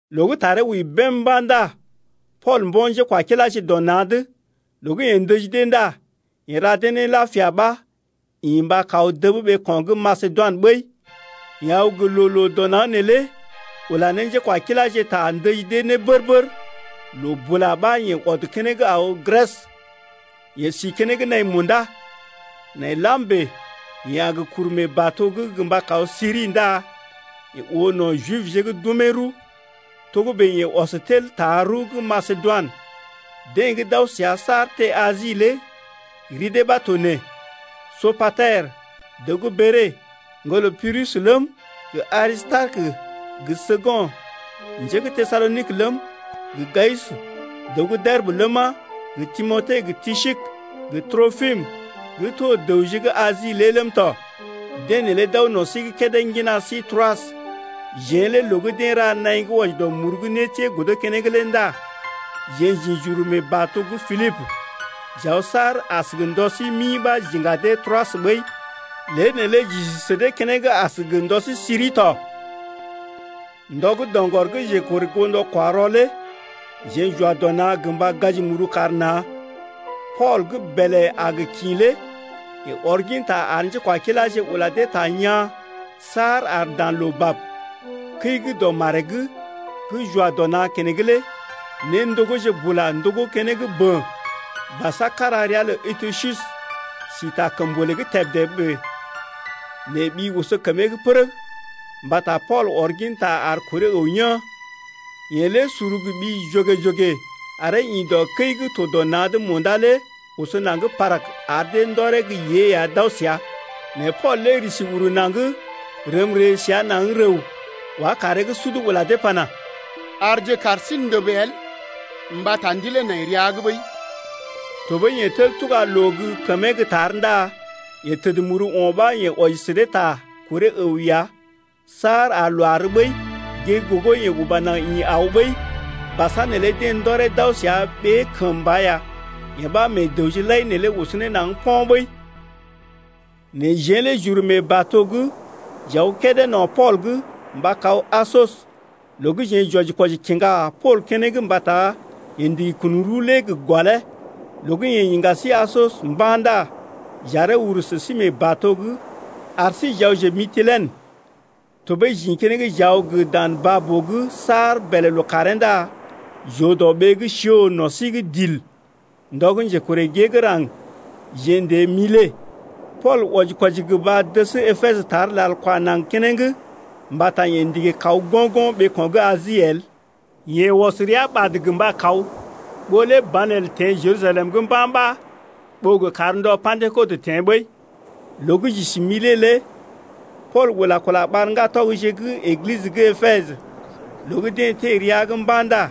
Loo gə́ taree wəi bèm mba̰ ndá Pool mbo̰ njékwakiláje dɔ na̰’d. Loo gə́ yeḛ ndəji dee ndá yeḛ ra dee ne lapia ɓa ḭ mba kaw dəb ɓeeko̰ gə́ Masedoinə ɓəi. Yeḛ aw gə loo-loo dɔ naŋg neelé ula ne njékwakiláje ta ndəji dee ne bər-bər loo bula ɓa yeḛ ɔd keneŋ aw Grɛs. Yeḛ si keneŋ naḭ munda. Nai lam bèe yeḛ a gə kuru mee bato’g gə mba kaw Siri ndá yeḛ oo no̰ Jibje gə́ d’umee rəw. Togə́bè yeḛ ɔs tel taa rəw gə́ Masedoinə. Deḛ gə́ d’aw səa saar teḛ Asi lé ri dee ɓa to nee: Sopater, dəw gə́ Bere, ŋgolə Pirus ləm, gə Arisitarekə gə Səkund njé gə́ Tesalonik ləm, gə Gayus, dəw gə́ Derbə ləma, gə Timote gə Tisik gə Tropim gə́ to dəwje gə́ Asi lé ləm tɔ. Deḛ neelé d’aw no̰ sí’g kédé ŋgina sí Troas. Jeḛ lé loo gə́ deḛ ra naḭ gə́ wɔji dɔ muru gə́ nétiee godo keneŋ lé ndá jeḛ j’ḭ j’uru mee bato’g Pilibə, j’aw saar as gə ndɔ sí mi ɓa j’iŋga dee Troas ɓəi. Lée neelé j’isi sə dee keneŋ as gə ndɔ sí siri tɔ. Ndɔ gə́ doŋgɔr gə́ njekorè goo ndɔ-kwa-rɔ lé jeḛ j’wa dɔ na̰ gə mba gaji muru kar na̰. Pool gə́ bèlè a gə kḭ lé yeḛ ɔr ginta ar njékwakiláje ula dee ta yaa̰ saar ar dan loo bab. Kəi gə́ dɔ maree’g gə́ j’wa dɔ na̰ keneŋ lé néndogóje bula ndogó keneŋ bən. Basa kára ria lə Etykus si ta kəmbolè’g tebdé bèe, nɛ ɓi oso kəmee’g pərəg mbata Pool ɔr ginta ar kuree əw yaa̰. Yeḛ lé suru gə ɓi jogè-jogè aree ḭ dɔ kəi gə́ to dɔ na̰’d munda lé oso naŋg parag ar dee ndɔree gə́ yée ya d’aw səa. Nɛ Pool lé risi uru naŋg rəm ree səa naŋg rəw wá kaaree’g sud ula dee pana: Arje kaar sí ndəb el mbata ndilee nai rəa’g ɓəi. Tɔɓəi yeḛ tel tuga loo gə́ kəmee gə́ tar ndá yeḛ təd muru o̰ ɓa yeḛ wɔji sə dee ta kuree əw ya saar ar loo àr ɓəi. Gée gə́ gogo yeḛ uba naŋg ḭ aw ɓəi. Basa neelé deḛ ndɔree d’aw səa ɓee kəmba ya. Yee ɓa meḛ dəwje lai neelé oso ne naŋg po̰ ɓəi. Nɛ jeḛ lé j’uru mee bato’g j’aw kédé no̰ Pool’g mba kaw Asos loo gə́ jeḛ j’wɔji-kwɔji kiŋga Pool keneŋ mbata yeḛ ndigi kun rəw lé gə gɔlee. Loo gə́ yeḛ iŋga sí Asos mba̰ ndá j’aree uru sə sí mee bato’g ar sí j’awje Mitilenə. Tɔɓəi j’ḭ keneŋ j’aw dan baa-boo’g saar bèlè lookàree ndá j’oo dɔ ɓee gə́ Siɔs no̰ sí’g dil. Ndɔ gə́ njekorè gée gə́ raŋg jeḛ n’teḛ Milet. Pool wɔji-kwɔji gə mba dəs Epesə tar lal kwa naŋg keneŋ mbata yeḛ ndigi kaw go̰-go̰ ɓeeko̰ gə́ Asi el. Yeḛ ɔs rəa ɓad gə mba kaw, ɓó lé banelə teḛ Jerusalem’g mba̰ ɓa ɓó gə kar ndɔ Pa̰dekɔt teḛ ɓəi. Loo gə́ j’isi Milet lé Pool ula kula ɓar ŋgatɔgje gə́ Eglisə gə́ Epesə. Loo gə́ deḛ teḛ rəa’g mba̰ ndá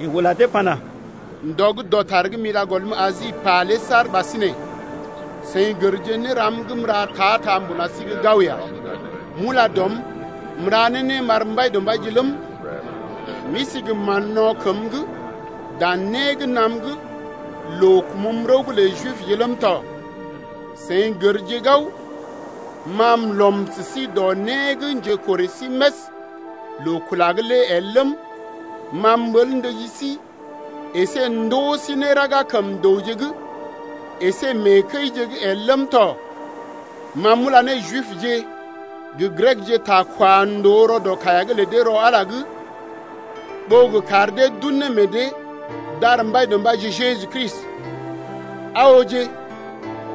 yeḛ ula dee pana: ndɔ gə́ dɔtar gə́ m’ila gɔlm Asi pà lé saar ɓasinè seḭ gərje néram gə́ m’ra ta-ta mbuna sí’g gao ya. M’ula dɔm m’ra ne né m’ar Mbaidɔmbaije ləm, m’isi gə mán-no̰ kəm’g dan né gə́ naam’g loo kumum rəw’g lə Jibje ləm tɔ. Seḭ gərje gao ma m’lɔm sə sí dɔ né gə́ njekorè sí més loo-kula’g lé el ləm, ma m’ɓəl ndəji sí əsé ndoo sí né raga kəm dəwje’g əsé mee kəije’g el ləm tɔ. Ma m’ula ne Jibje gə Grekje ta kwa ndòo rɔ dɔ kaiya’g lə dee rɔ Ala’g lé ɓó gə kar dee d’un ne meḛ dee d’ar Mbaidɔmbaije Jeju Kristi. Aa ooje,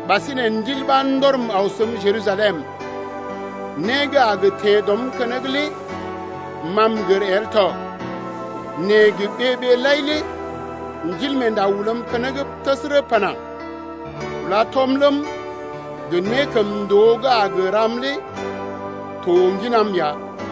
ɓasinè Ndil ɓa ndɔrm aw səm Jerusalem, né gə́ a gə teḛ dɔm’g keneŋ lé ma m’gər el tɔ. Nɛ gə ɓee-ɓee lai lé Ndilmeenda ulam keneŋ təsərə pana: Kula tɔm ləm, gə nékəmndoo gə́ a gə ram lé to ŋginam ya.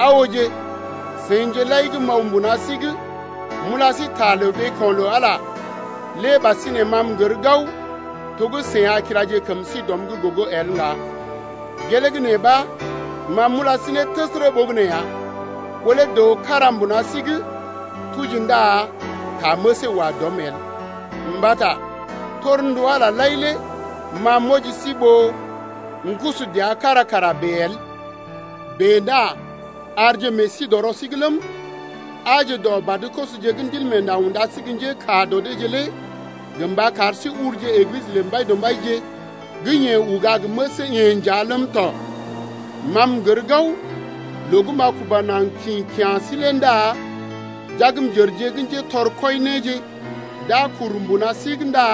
Aa ooje, seḭje lai gə́ m’aw mbuna sí’g m’ula sí ta lə ɓeeko̰ lə Ala lé ɓasinè ma m’gər gao to gə́ seḭ a kilaje kəm sí dɔm’g gogo el ŋga. Gelee gə́ nee ɓa ma m’ula sí ne təsərə ɓogənè ya, ɓó lé dəw kára mbuna sí’g tuji ndá ta məsee wa dɔm el. Mbata torndu Ala lai lé ma m’wɔji sí ɓó m’kusu dəa kára kara bèe el. Bèe ndá arje meḛ sí dɔ rɔ sí’g ləm, aaje dɔ badə-kosoje gə́ Ndilmeenda unda sí gə́ njékaa dɔ deeje lé gə mba kar sí ulje Eglisə lə Mbaidɔmbaije gə́ yeḛ uga gə məsee-yeḛ nja ləm tɔ. Ma m’gər gao loo gə́ m’a kuba naŋg kḭ kya̰ sí lé ndá jagmjərje gə́ njetɔr kwɔi néje d’a kuru mbuna sí’g ndá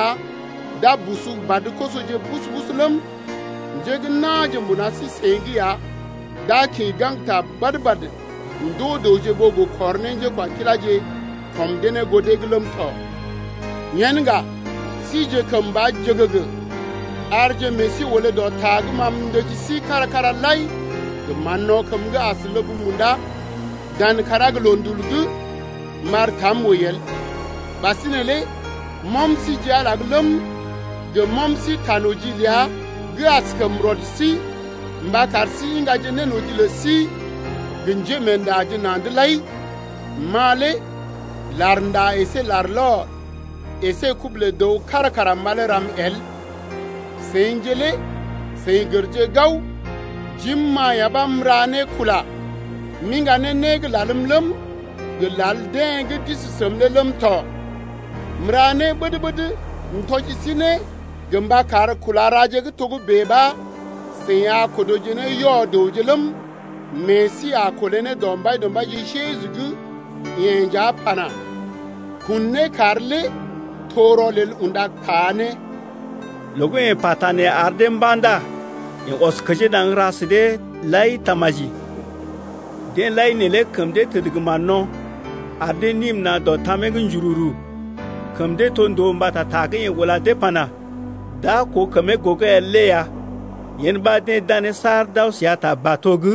d’a busu badə-kosoje busu-busu ləm, njé gə́ na̰je mbuna sí-seḭ’g ya d’a kḭ gaŋgta badə-badə ndoo dəwje ɓó gə kɔr ne njékwakiláje kɔm dee ne goo dee’g ləm tɔ. Yen ŋga sije kəmba jəgəgə, arje meḛ sí olé dɔ ta gə́ ma m’ndəji sí kára-kára lai gə mán-no̰ kəm’g as ləb munda, dan kàrá gə loondul’g m’ar tam wəi el. Ɓasinè lé m’ɔm sí ji Ala’g ləm, gə m’ɔm sí ta noji ləa gə́ askəm rɔd sí mba kar sí iŋgaje nénoji lə sí gə njémeendaje na̰’d lai. Ma lé larnda əsé larlɔr əsé kubu lə dəw kára kara malee ram el. Seḭje lé seḭ gərje gao jim-ma ya ɓa m’ra ne kula m’iŋga ne né gə́ lalm ləm, gə lal deḛ gə́ d’isi səm lé ləm tɔ. M’ra né ɓəd-ɓəd m’tɔji sí né gə mba kar kula raje gə́ togə́bè ɓa seḭ a kodoje ne yɔ-dəwje ləm, meḛ sí a kolé ne dɔ Mbaidɔmbaije Jeju gə́ yeḛ nja pana: Kun né kar lé to rɔlel unda taa né! Loo gə́ yeḛ pata nee ar dee mba̰ ndá yeḛ ɔs kəjee naŋg ra sə deḛ lai tamaji. Deḛ lai neelé kəm dee təd gə mán-no̰, ar dee nim na̰ dɔ tamee’g njururu. Kəm dee to ndòo mbata ta gə́ yeḛ ula dee pana: D’a koo kəmee gogo el lé ya. Yen ɓa deḛ danee saar d’aw səa ta bato’g.